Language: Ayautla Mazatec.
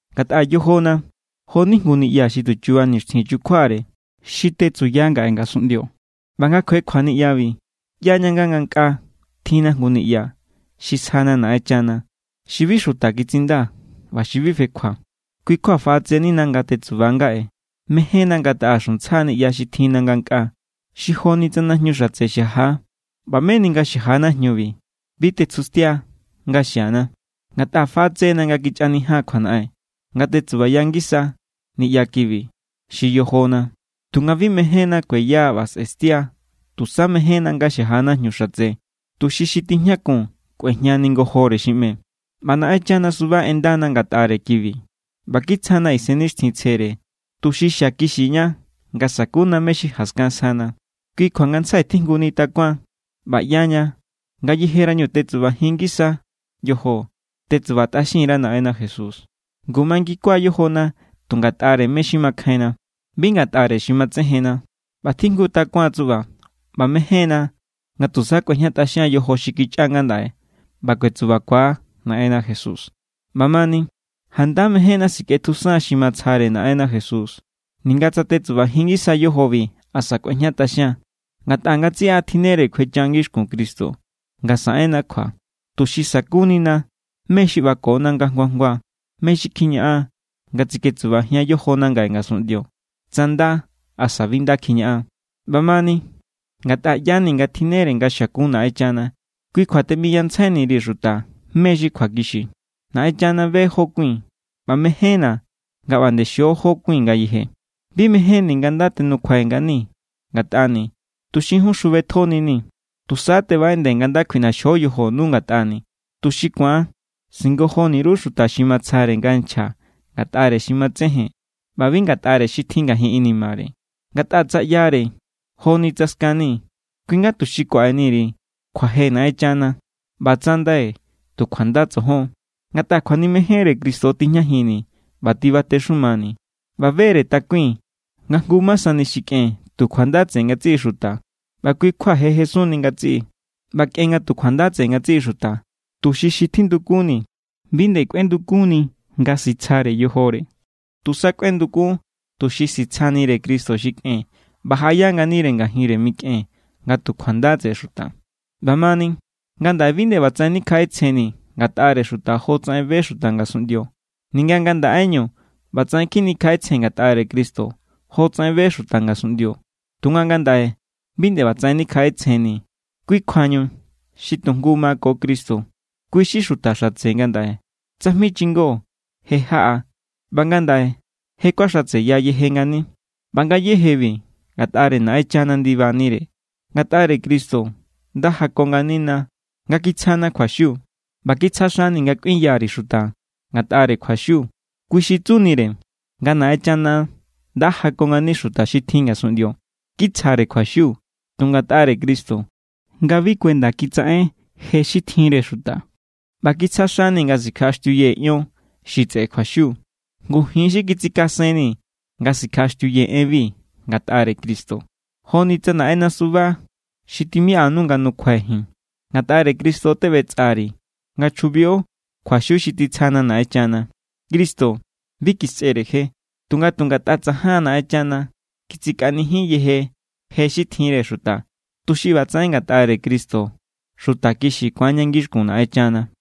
Ngatꞌa yojona jo=ni jngu niꞌya xi tu chuba nixtjin chukjuare xi tetsuya ngaꞌe ngasunꞌndio. ꞌBa nga kjuekjua niꞌyabi, ꞌyaña nga ngankꞌaa tjinna jngu niꞌya xi sjana Naꞌenchana, xi bi xuta kitsinda ꞌba xi bi fekjua. Kui= kjua faꞌatsenina nga tetsuba ngaꞌe. Mejénna nga taꞌa xuntsja niꞌya xi tjinna ngankꞌaa xi joni tsa najñu xatse xaja. ꞌBa meni nga xaja najñubi, bi tetsjustia nga xiana. Ngatꞌa faꞌatse=na nga kichꞌanijian kjuanaꞌen, nga tetsubaya ngisa niꞌya kibi xi yojona. Tunga bi mejénna kueya ꞌba sꞌe̱stia. Tusa mejénna nga xaja najñu xatse, tuxi xi tijñakun kꞌuejñani ngojore xi ꞌme. ꞌBa Naꞌenchana suba ꞌendana ngatꞌare kibi ꞌba kitsjana Isennixtjintsjere, tuxi xiakixiña nga sakuna mé= xi jaskan sjana. Kui kjua ngantsjai tjijnguni takuan ꞌba ꞌyaña ngayejerañu tetsubajin ngisa yojo, tetsubatꞌaxin_ra Naꞌenna Jesús. Ngu mangikua yojona tu ngatꞌare mé= xi makjainna, bi ngatꞌare xi matsejenna. ꞌBa tjijngu takuan tsuꞌba, ꞌba mején=na nga tusa kꞌuejñatꞌaxian yojo xi kichꞌa ngandaꞌe ꞌba kuetsubakua Naꞌenna Jesús. ꞌBamani, janda mejénna sikꞌetjusan xi matsjare Naꞌenna Jesús, ninga tetsubajin ngisa tsa yojobi asa kꞌuejñatꞌaxian. Ngatꞌa ngatsiꞌa tjinnere kjuecha ngixkun Cristo nga saꞌenna kjua, tuxi sa̱kunina mé= xi ꞌbakona nga jngua jngua, mé= xi kjiñaꞌan nga tsiketsubajian yojona ngaꞌe ngasunꞌndio, tsa nda asa bi nda kjiñaꞌan. ꞌBamani, ngatꞌa ꞌya=ni nga tjinnere nga xiakun Naꞌenchana, kui= kjua teꞌmiyantsjaini_ri̱ xuta mé= xi kjuakixi. Naꞌenchana be= jó kui̱n, ꞌba mejénna̱ nga ꞌba nde xio jó kui̱n ngayeje. Bi mejénni̱ nga nda tenukjua nganii̱ ngatꞌani̱, tuxi jun xjubetjonii̱. Tusa tebaꞌeꞌndee̱ nga nda kjuiꞌnaxjo yojonu ngatꞌani̱, tuxi ku̱an singojoni_ru xuta xi matsjare nga nchja ngatꞌare xi matsejen ꞌba bi ngatꞌare xi tjin ngajin inimare. Ngatꞌa tsa ꞌyare joni tsa skani̱, kui= nga tuxi kuaꞌeni_ri̱ kjuaje Naꞌenchana. ꞌBa tsa ndai̱, tu kjuanda tsojon. Ngatꞌa kjuanimejenre Cristo= tijñajinni̱ ꞌba tibatexumani̱. ꞌBa be=re takui̱n nga jngu ma sani xi kꞌen tu kjuanda tseꞌe ngatsiꞌi xuta ꞌba kui= kjua je jesunni ngatsiꞌi. ꞌBa kꞌen nga tu kjuanda tseꞌe ngatsiꞌi xuta, tuxi xi tjindukunnii̱ bi nde kꞌuendukunni nga sitsjare yojore. Tusa kꞌuendukun tuxi sitsjanire Cristo xi kꞌen ꞌba jaꞌaya nganire ngajinre mikꞌen nga tu kjuanda tseꞌe xuta. ꞌBamani, ngandaꞌe bi nde ꞌbatsaꞌen nikjaꞌetsjennii̱ ngatꞌare xuta jotsaꞌen be xuta ngasunꞌndio. Ninga ngandaꞌeñu ꞌbatsaꞌen kjinikjaꞌetsjee̱n ngatꞌare Cristo jotsaꞌen be xuta ngasunꞌndio, tunga ngandaꞌe bi nde ꞌbatsaꞌen nikjaꞌetsjennii̱. Kui kjuañu xi tu jngu mako Cristo, kui= xi xuta xatse ngandaꞌe. Tsajmi chingo je= jaꞌa. ꞌBa ngandaꞌe, je= kuaxatseya yeje ngani. ꞌBa ngayéjebi ngatꞌare Naꞌenchana ndibanire. Ngatꞌare Cristo nda jako nganina nga kitsjana kjuaxiu. ꞌBa kitsja xani̱ nga kꞌuinya_ri̱ xuta ngatꞌare kjuaxiu. Kui xi tsunire nga Naꞌenchana nda jako ngani xuta xi tjin ngasunꞌndio. Kitsjare kjuaxiu tu ngatꞌare Cristo nga bi kuenda kitsaꞌen je xi tjinre xuta. ꞌBa kitsja xani̱ nga sikjaꞌaxtiuyee̱ ion xi tseꞌe kjuaxiu. Ngu ji̱n= xi kitsikasenni̱ nga sikjaꞌaxtiuyee̱ enbi ngatꞌare Cristo. Joni tsa Naꞌenna suba xi timiꞌanu nga nukjuai̱ ji̱n. Ngatꞌare Cristo teꞌbetsꞌari̱ nga chjubio kjuaxiu xi titsjanu Naꞌenchana. Cristo bi kisꞌere je. Tunga tu ngatꞌa tsajan Naꞌenchana kitsikaꞌanijin yeje je xi tjinre xuta, tuxi ꞌbatsaꞌen ngatꞌare Cristo xuta kixi ku̱anña ngixkun Naꞌenchana.